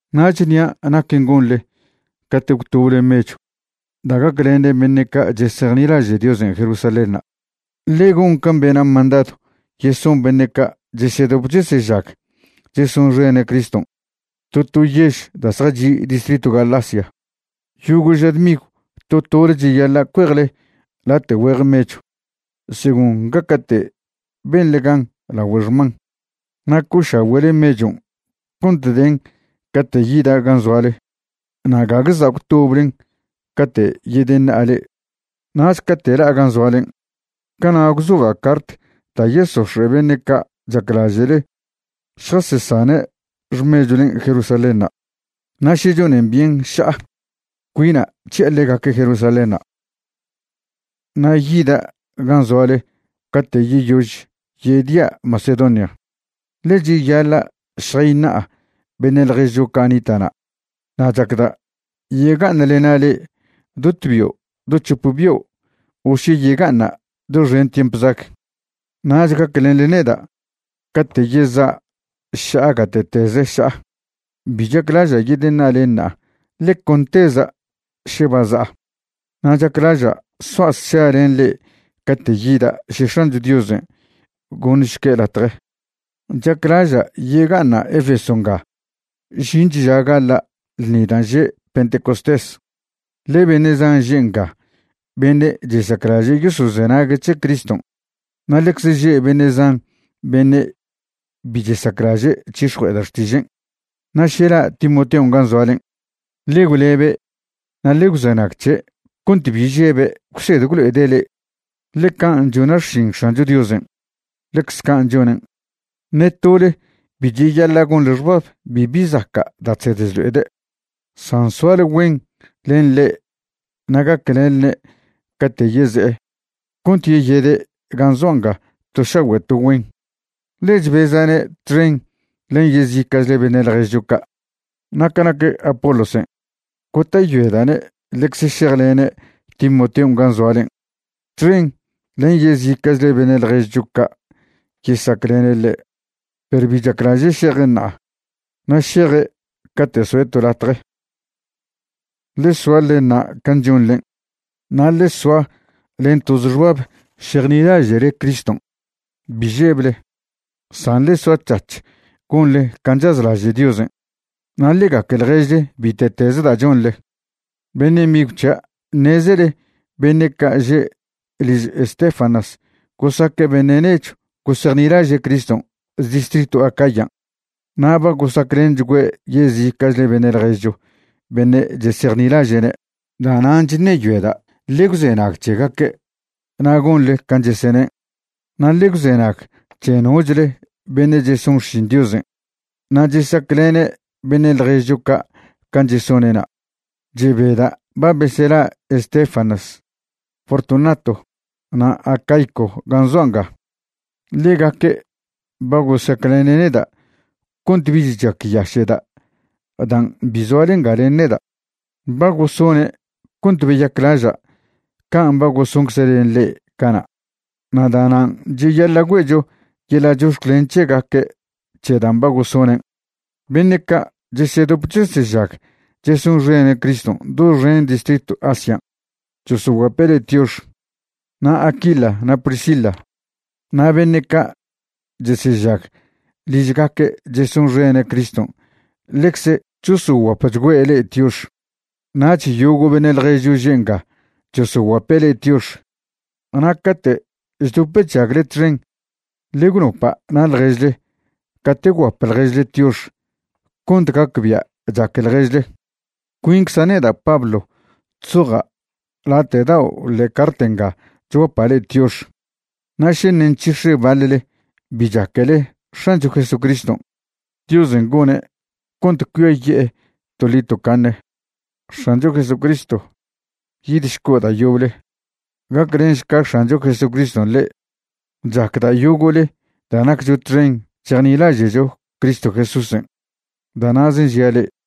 Nach ṉia' naquen' gonḻe cate' gwtoble mechw da' gaclenen beṉe' ca' chesejnilaže' Diosen' Jerusalénṉa'. Ḻe gon can' bena' mandadw yeson beṉe' ca' chesedop chesežag chesonxene' Criston' to to yež da' zjachi' distritw Galacia. Yogo' ža dmigw to tole cheyaḻa' cuejle late' güeje mechw según gaca'te' benḻe gan lagüe' xman. Na' co'ošagüe'le mechon' cont den cate' yida' gan' zoale na' gague za' gwtoblen cate' yedeṉa'a le'e. Nach cate' la'a gan' zoalen', cana' gwzoja' cart da' yesox̱e' beṉe' ca' chaclaže'le šjasesane' xmechwlen' Jerusalénṉa'. Na' še chonen byen ša'a, cuina' c̱hi'a ḻegaque' Jerusalénṉa'. Na' yida' gan' zoale cate' yeyož yedia' Macedonia, ḻe cheyaḻa' šjayṉa'a beṉe' ḻježcho ca' nita' na'. Na' chacda' yega'aṉlena' le'e do tbio' do c̱hop bio' o še yega'aṉa' doxen tiemp zag, nach gaclenḻe neda' cate' yeza' ša'a gate'teze ša'a. Bi chaclaža' yedeṉa'a le'e ṉa'a, ḻe con teza' še ba za'a, na' chaclaža' soa' sša len le'e cate' yida' še X̱ancho Diosen' goṉšque' latje. Chaclaža' yega'aṉa' Efeso nga žinch ža gaḻa' ḻṉi dan' že' Pentecostés. Ḻe beṉe' zan že' nga beṉe' chesaclaže' yosozenague' c̱he Criston' na' ḻecze že' beṉe' zan beṉe' bi chesaclaže' c̱hix̱jue'eda' xtižen'. Na' še la' Timoteon' gan' zoalen', ḻe gwlebe' na' ḻe gwzenag c̱he' cont bi žebe' gwsed gwlo'ede' le'e, ḻe can' chona' xšin X̱ancho Diosen', ḻecz can' chonen'. Ṉe tole bi cheyaḻa' gonḻe xbab bibi zaca' da' chsed chlo'ede', san soale güen len ḻe' na' gaclenḻne' cate' yeze'e cont yeyede' gan' zoa' nga to šagüe' to güen, ḻe chbeza'ne' txen len yezica'chle beṉe' ḻježcho ca'. Na' ca nac Apolosen', gota'yoeda'ne' ḻecze šejlene' Timoteon' gan' zoalen', txen len yezica'chle beṉe' ḻježcho ca' yesaclene' ḻe'. Perw bi chaclaže' šeje' ṉa'a, na' šeje' cate' soe' to latje. Ḻe soa ḻe ṉa' can' chonḻen', na' ḻe soa len toze xbab šejnilaže'le Criston'. Bi žeble, san ḻe soac̱hac̱h gonḻe can' chazlaže' Diosen'. Na' ḻe gaque ḻježle bite'teze da' chonḻe. Beṉe' migw c̱hia', ṉezele beṉe' ca' že' liž Estéfanas gosaque' beṉe' nechw gosejnilaže' Criston' distritw Acayan' na' ba gosaclenchgüe' yezica'chle beṉe' ḻježcho beṉe' chesejnilaže'ne'. Da'nan' chṉeyoeda' ḻe gwzenag c̱hegaque' na' gonḻe can' chesenen', na' ḻe gwzenag c̱he nochle beṉe' cheson xšin Diosen' na' chesaclene' beṉe' ḻježcho ca' can' chesone'na'. Chebeda' ba besela' Estéfanas, Fortunato, na' Acaico gan' zoa' nga. Ḻegaque' ba gosaclene' neda' cont bich chacyaše'da' dan' bi zoale nga len neda'. Ba gosone' cont beyaclaža' can' ba gosoncze' len le'e cana', na' da'nan' cheyaḻa' güe'cho yeḻa' chox̱clen c̱hegaque' c̱he dan' ba gosonen'. Beṉe' ca' chesedop chesežag chesonxene' Criston' doxen distritw Asian' chosoguape' le'e tiox. Na' Aquila na' Priscila na' beṉe' ca' chesežag ližgaque' chesonxene' Criston' ḻecze chosoguapchgüe' le'e tiox. Nach yogo' beṉe' ḻježcho že' nga chosoguape' le'e tiox. Na' cate' chdop chžagle txen, ḻe gwnopa' na' ḻježle cate' gwguap ḻježle tiox cont gacbia' chaque ḻježle. Cuincza' neda' Pablo chzoja' late' dao' ḻe'e cart nga chguapa' le'e tiox. Na' še ṉe' nc̱hix̱e baḻle bi chaquele X̱ancho Jesucriston', Diosen' gone' cont cuiaye'e toḻi tocaṉe. X̱ancho Jesucristo, yidšco' da' yoble. Gaclenšca X̱ancho Jesucriston' le'e. Chacda' yogo'le da' naccho txen chejnilaže'cho Cristo Jesúsen'. Da' na'zen' žia' le'e.